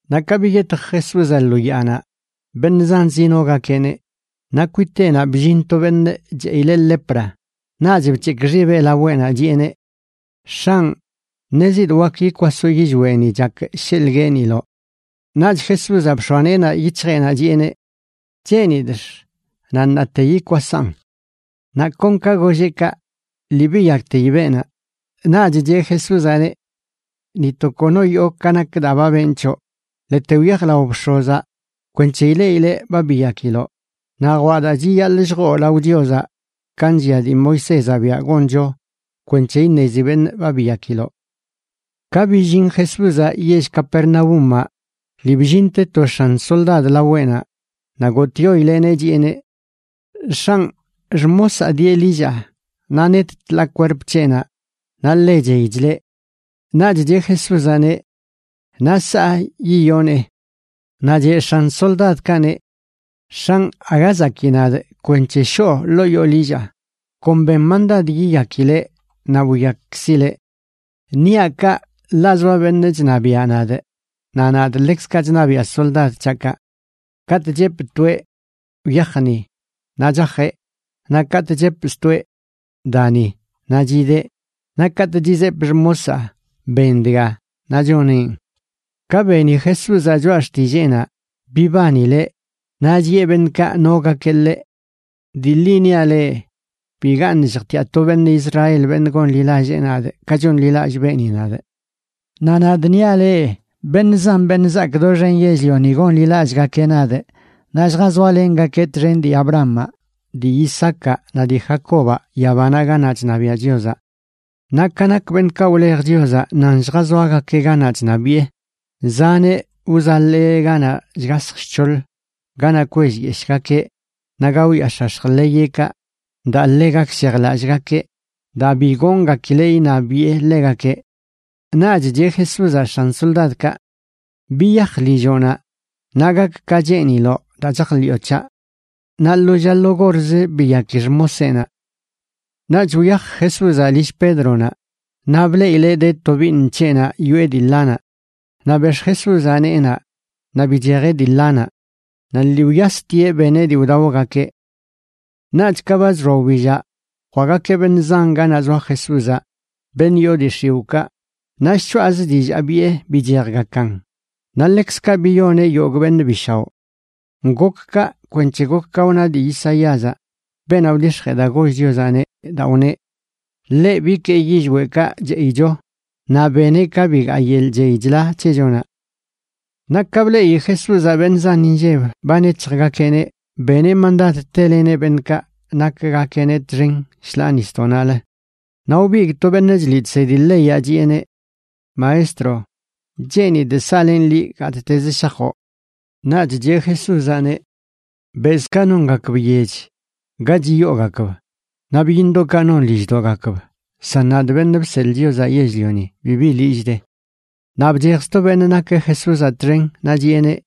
Naꞌ ka biyetj Jesúzaꞌ lo yaanaꞌ, beṉꞌ zan zinogakeꞌneꞌ. Naꞌ kwiteꞌnaꞌ bllin to beṉꞌ cheꞌileꞌ lepraꞌ, naꞌch bc̱hekꞌ xibeꞌ laweꞌnaꞌ, chiꞌeneꞌ: ―X̱anꞌ, ṉezidꞌ wak yikwasoꞌ yillweꞌni chakꞌ sheḻꞌ gueeniloꞌ. Naꞌch Jesúzaꞌ bx̱oa neenaꞌ yic̱hjeꞌnaꞌ, chiꞌeneꞌ: ―Cheenidꞌx. Naꞌ ṉaate yikwasaꞌn. Naꞌ kon ka golleꞌ kaꞌ, lii biyakteyi beenaꞌ. Naꞌch cheꞌ Jesúzaꞌneꞌ: ―Ni to kono yoo ka nak daa ba benꞌ c̱hoꞌ. Ḻete wyaj lao bx̱ozaꞌ kwenc̱he ileꞌileꞌ ba biyakiloꞌ, naꞌ jwaꞌ daa chiyaḻꞌ lljoo lao Chiozaꞌ ka nllia dii Moisézaꞌ biaꞌ goncho kwenc̱he iṉezi beṉꞌ ba biyakiloꞌ. Ka billin Jesúzaꞌ yell Capernaúmaꞌ lii bllinte to x̱an soldad laweꞌnaꞌ, naꞌ gotꞌyoileꞌneꞌ, chiꞌeneꞌ: ―X̱anꞌ, xmosaa dieꞌ lillaa, naꞌ net tḻaa kwerp c̱heꞌnaꞌ naꞌ ḻe chey chleꞌ. Naꞌch cheꞌ Jesúzaꞌneꞌ: ―Naꞌ saꞌ yiyonee. Naꞌ cheꞌ x̱an soldadkaꞌneꞌ: ―X̱anꞌ, aga zakii nadꞌ kwenc̱he shoo ḻoo yoo lillaa. Kon ben mandad yiyakileꞌ naꞌ wiyakkzileꞌ. Niaꞌ kaꞌ ḻaꞌ zoa beṉꞌ chṉabiaꞌ nadꞌ, naꞌ nadꞌ ḻekzkaꞌ chṉabiaꞌ soldad c̱haꞌkaꞌ. Katꞌ chepꞌ toeꞌ: “Wyaj niꞌ”, naꞌ chajeꞌ; naꞌ katꞌ chepꞌ stoeꞌ: “Da ni”, naꞌ chideꞌ; naꞌ katꞌ chizepꞌ xmosaa: “Ben dga”, naꞌ choneꞌn. Ka beni Jesúzaꞌ choꞌa xtilleenaꞌ, bibanileꞌ naꞌ chiꞌe beṉꞌkaꞌ nogakeꞌ ḻeꞌ: ―Dii ḻi niaꞌ leꞌ, bigaṉꞌ lljtiaꞌ to beṉꞌ Israel beṉꞌ gonḻilallee nadꞌ ka chonḻilallꞌ beeni nadꞌ. Naꞌ nadꞌ niaꞌ leꞌ, beṉꞌ zan beṉꞌ zaak doxen yell-lioni gonḻilallꞌgakeꞌ nadꞌ naꞌ lljazoalengakeꞌ txen dii Abrahamaꞌ, dii Isaacaꞌ naꞌ dii Jacobaꞌ yabanaꞌ ganaꞌ chṉabiaꞌ Chiozaꞌ. Naꞌ ka nak beṉꞌkaꞌ wlej Chiozaꞌ nan lljazoagakeꞌ ganaꞌ chṉabiꞌe, zaneꞌ wzaḻee ganaꞌ shgasj shc̱hoḻ, ganaꞌ kwellyeshꞌgakeꞌ naꞌ gaoyaax̱ax̱j ḻeyeꞌkaꞌ daa ḻe gakshejlallꞌgakeꞌ, daa bi goongakileꞌ iṉabiꞌe ḻegakeꞌ. Naꞌch cheꞌ Jesúzaꞌ x̱an soldadkaꞌ: ―Biyaj lilloꞌnaꞌ, naꞌ gak ka cheeniloꞌ daa chajḻiꞌo c̱haꞌ. Naꞌ lo lla lo gorzə biyaki xmoseꞌnaꞌ. Naꞌch wyaj Jesúzaꞌ lill Pédronaꞌ, naꞌ bleꞌileꞌ de tobiiṉ c̱heꞌnaꞌ yoꞌe dii ḻanaꞌ. Naꞌ bex̱ꞌ Jesúzaꞌ neenaꞌ naꞌ bichejeꞌ dii ḻanaꞌ. Naꞌ lii wyastieꞌ beneꞌ dii wdaogakeꞌ. Naꞌch ka ba chxoa wbillaꞌ, jwaꞌgakeꞌ beṉꞌ zan ganaꞌ zoa Jesúzaꞌ, beṉꞌ yoo dii x̱iwꞌkaꞌ, naꞌ shchoꞌazə dillaa biꞌe bichejgakan. Naꞌ ḻekzkaꞌ biyoneꞌ yogꞌ beṉꞌ bi shaoꞌ. Gok kaꞌ kwenc̱he gok ka wna dii Isaíazaꞌ, beenaꞌ wdix̱jee daa goll Chiozaꞌneꞌ, daa wneꞌ: “Ḻeꞌ bikee yillweꞌkaꞌ cheꞌicho naꞌ beneꞌ ka bigaa yeḻꞌ chey chla c̱hechonaꞌ.” Naꞌ ka bleꞌi Jesúzaꞌ beṉꞌ zan inlleb ba nec̱hjgakeꞌneꞌ, beneꞌ mandad teleneꞌ beṉꞌkaꞌ nakgakeꞌneꞌ txen shḻaa nisdoꞌnaꞌlə. Naꞌ wbigꞌ to beṉꞌ chliꞌ chsedi leyaꞌ, chiꞌeneꞌ: ―Maestro, cheenidꞌ saꞌlenꞌ liꞌ gattezə shajoꞌ. Naꞌch cheꞌ Jesúzaꞌneꞌ: ―Bezꞌkaꞌ nongakb yech ga chiyoogakb, naꞌ byiṉdoꞌkaꞌ non lilldoꞌgakb, san nadꞌ, Beṉꞌ Bseḻꞌ Chiozaꞌ Yell-lioni, bibi lillꞌ de. Naꞌ bchej sto beṉꞌ nakeꞌ Jesúzaꞌ txen naꞌ chiꞌeneꞌ: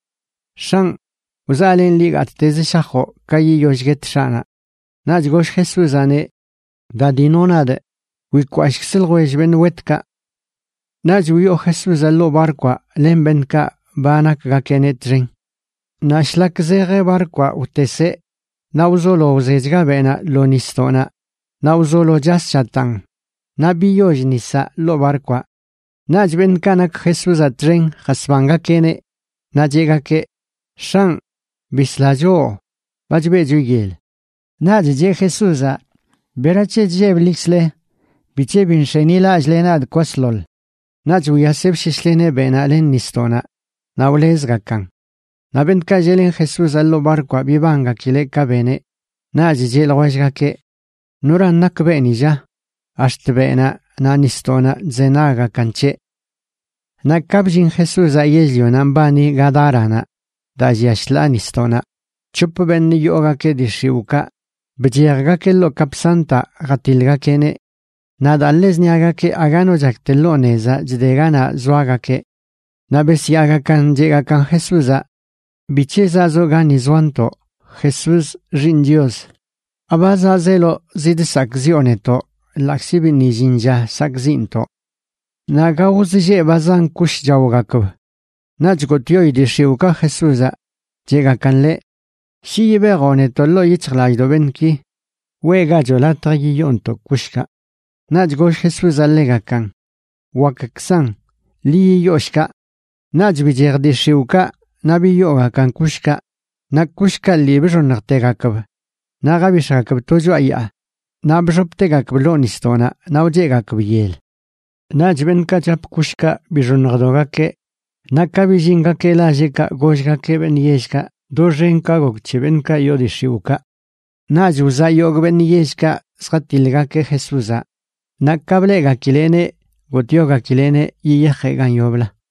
―X̱anꞌ, wzaꞌlenꞌ liꞌ gattezə shajoꞌ ka yiyoll guet x̱aꞌnaꞌ. Naꞌch goll Jesúzaꞌneꞌ: ―Da, dino nadꞌ. Wikwashꞌkzə ljwell beṉꞌ wetkaꞌ. Naꞌch wyoo Jesúzaꞌ ḻoo barkwaꞌ len beṉꞌkaꞌ ba nakgakeꞌneꞌ txen. Naꞌ shlak zej barkwaꞌ wteseꞌ. Naꞌ wzolo wzechga beꞌnaꞌ lo nisdoꞌnaꞌ, naꞌ wzolo chas chataan naꞌ biyoll nisaꞌ ḻoo barkwaꞌ. Naꞌch beṉꞌkaꞌ nak Jesúzaꞌ txen jasbangakeꞌneꞌ, naꞌ cheꞌgakeꞌ: ―¡X̱anꞌ, bisla choꞌ! ¡Ba chbeꞌcho yel! Naꞌch cheꞌ Jesúzaꞌ: ―¿Berac̱he chlleblikzle? ¿Bic̱he bi nx̱enilallꞌle nadꞌ kwasḻoḻ? Naꞌch wyaseꞌ bsheshleneꞌ beꞌnaꞌ len nisdoꞌnaꞌ, naꞌ wlezgakan. Naꞌ beṉꞌkaꞌ lleꞌlen Jesúzaꞌ ḻoo barkwaꞌ bibangakileꞌ ka beneꞌ, naꞌch cheꞌ ljwellgakeꞌ: ―¿Noran nak beeni, lla? Ax̱t beꞌnaꞌ naꞌ nisdoꞌnaꞌ chzenaggakan c̱heꞌ. Naꞌ ka bllin Jesúzaꞌ yell-lionaꞌ mbani Gadáranaꞌ daa llia shḻaa nisdoꞌnaꞌ, c̱hop beṉꞌ yoogakeꞌ dii x̱iwꞌkaꞌ bchejgakeꞌ ḻoo kapsantaꞌ jatiḻgakeꞌneꞌ. Naꞌ daa ḻe zṉiagakeꞌ aga no chak te lo nezaꞌ chde ganaꞌ zoagakeꞌ. Naꞌ besyaagakan cheꞌgakan Jesúzaꞌ: ―¿Bic̱he zaꞌzoꞌ gani zoantoꞌ, Jesús, Xiiṉ Chios? ¿Aba zaꞌzeloꞌ zidsakꞌziꞌo netoꞌ ḻaꞌkzi biṉꞌ illin lla sakꞌziꞌntoꞌ? Naꞌ gaoz lleꞌ ba zan kush chaogakb. Naꞌch gotꞌyoi dii x̱iwꞌkaꞌ Jesúzaꞌ, cheꞌgakan ḻeꞌ: ―Shi yibejoꞌ netoꞌ ḻoo yic̱hjlallꞌdoꞌ beṉꞌki, weꞌgachoꞌ latj yiyoontoꞌ kushkaꞌ. Naꞌch goll Jesúzaꞌ ḻegakan: ―Wakkzan. Ḻi yiyoo shkaꞌ. Naꞌch bichej dii x̱iwꞌkaꞌ naꞌ biyoogakan kushkaꞌ, naꞌ kushkaꞌ lii bxoṉjtegakb naꞌ jabix̱gakb to choꞌa yaa naꞌ bxoptegakb ḻoo nisdoꞌnaꞌ naꞌ wcheꞌgakb yel. Naꞌch beṉꞌkaꞌ chap kushkaꞌ bixoṉjdogakeꞌ, naꞌ ka billingakeꞌ lalleꞌkaꞌ gollgakeꞌ beṉꞌ yellkaꞌ doxen ka gok c̱he beṉꞌkaꞌ yoo dii x̱iwꞌkaꞌ. Naꞌch wzaꞌ yogꞌ beṉꞌ yellkaꞌ zjatiḻgakeꞌ Jesúzaꞌ, naꞌ ka bleꞌgakileꞌneꞌ gotꞌyogakileꞌneꞌ yiyajeꞌ gan yoblə.